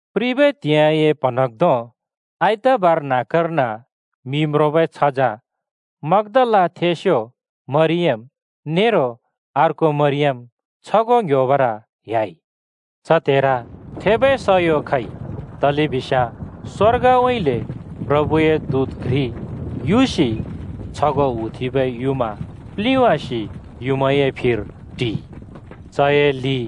प्रिबै त्हिंइए प्हँन्हाँग्धों आइतबार न्‍हाँक्‍कर्न मि म्रोंबै छझँ मग्‍दालाथेंस्‍यो मरियम नेरो अर्को मरियम छगों ङ्‌ह्‍योबर ह्‍याइ। च त्हेर थेबै सयो खइ, तलेबिस्याँ स्‍वर्गउँइँले प्रभुए दूत घ्रि युसि छगों हुथेंबै युँमा प्लिंवासि युँमाए फिर टिइ। चए लि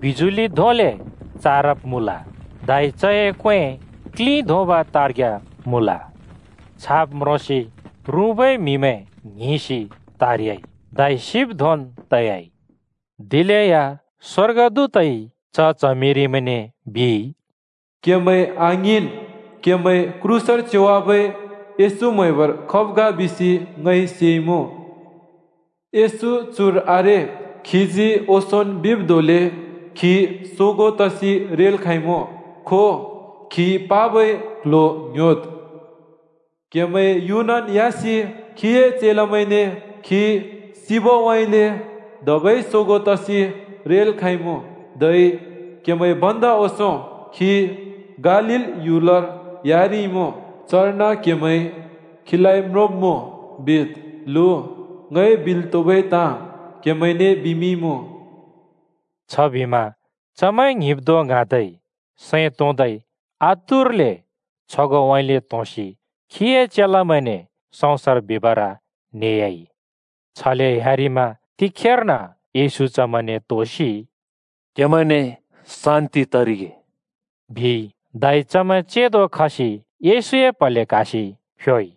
बिजुलि धोंले चारब मुँल, धै चए क्‍वें क्‍लिं धोंब तार्ग्‍या मुँल। छाब् म्रोंसि रुँबै म्हिमैं ङ्हिंसि त्‍हारइ, धै सिब् धोंन् तयाइ। दिलेया स्‍वर्गदूतइ च च्हमिरिमैंने बिइ, “क्‍हेमैं आङ्हिंन्! क्‍हेमैं क्रूसर च्योवाबै येशू म्‍हैबर खब् ग बिसि ङइ सेइमुँ। येशू चुर आरे। खीजी ओंसोंन् बिब् धोंले खी सोगों तसि रेल् खाँइमुँ। खो, खी पाबै क्‍ल्‍ह्‍यो ङ्‌ह्‍योद्। क्हेमैं युनन् ह्‍यासि खीए चेलामैंने ‘खी सिबउँइँले धेबै सोगों तसि रेल् खाँइमुँ। धै क्‍हेमैं भन्दा ओंसों खी गालील ह्‍युलर ह्‍यारिइमुँ। चर्न क्‍हेमैंइ खीलाइ म्रोंब्‍मुँ,’ बिद्, लु, ङइ बिल् त्हुबै ताँ क्हेमैने बिमिंइमुँ।” छबिमा चमैं ङ्हिंब् धों ङ्हाँदै सैं तोंदै आतुरले छगोंउँइँले त्होंसि खीए चेलामैंने सँउँसर बिबर न्हेह्‍याइ। छले ह्‍यारिमा तिखेर्न येशू चमैंने त्‍होसि “क्हेमैंने शान्ति तरिगे,” बिइ। धै चमैं चेंदो खसि येशूए प्‍हले क्‍हासि फ्‍योइ।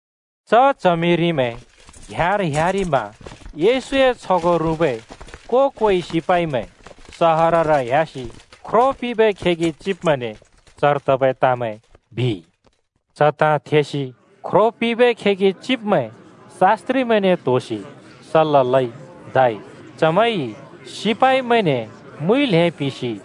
च च्हमिरिमैं घ्याँर ह्‍यारिमा येशूए छगों रुँबै को-कोइ सिपाइमैं सहरर ह्‍यासि ख्रो पिंबै खेगि चिब्मैंने चर तबै ताँमैं बिइ। च ताँ थेसि ख्रो पिंबै खेगि चिब्मैं शास्‍त्रिमैंने त्‍होसि सल्‍ला लइ, धै चमैंइ सिपाइमैंने मुइ ल्‍हें पिंसि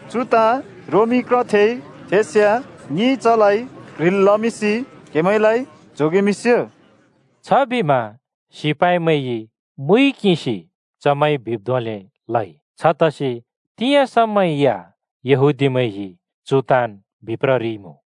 चु ताँ रोमी क्रथेइ थेस्याँ ङिइ चलाइ क्ह्रिल् लमिंसि क्हेमैंलाइ जोगेमिंस्यो।” छबिमा सिपाइमैंइ मुइ किंसि चमैंइ बिब् धोंले लइ। छतसि तिंयाँ समा या यहूदीमैंइ चु ताँन् बिप्ररिइमुँ।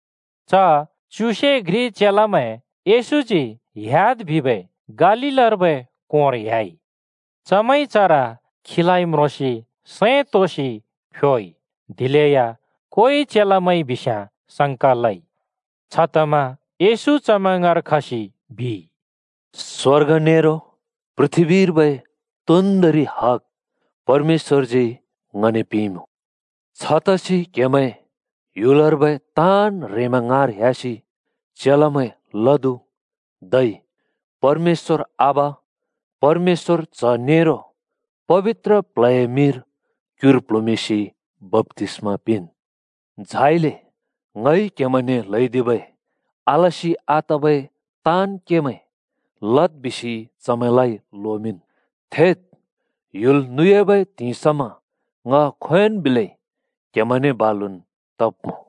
च च्युसे घ्रि चेलामैं येशूजी ह्‍याद् बिबै गालीलर्बै कोंर ह्‍याइ। चमैंइ चर खीलाइ म्रोंसि सैं तोंसि फ्‍योइ, दिलेया कोइ चेलामैंइ बिस्याँ संका लइ। छतमा येशू चमैं ङाँर खसि बिइ, “स्वर्ग नेरो पृथ्‍बीर्बै तोन्दोंरि हग परमेश्‍वरजी ङने पिंइमुँ। छतसि क्‍हेमैं ह्‍युलर्बै ताँन् ह्रेंमैं ङाँर ह्‍यासि चेलामैं लदु, धै परमेश्‍वर आबा, परमेश्‍वर च्‍ह नेरो पबित्र प्ल्हए मिंर क्‍युर प्‍ल्हुँमिंसि बप्‍तिस्‍मा पिंन्। झाइले ङइ क्‍हेमैंने ल्हैदिबै आलसि आतबै ताँन् केमैं लद् बिसि चमैंलाइ लोमिंन्। थेद्! ह्‍युल नुयाबै त्हिंइ समा ङ खोंयोंन् बिलै क्‍हेमैंने बालुन् तब्मुँ।”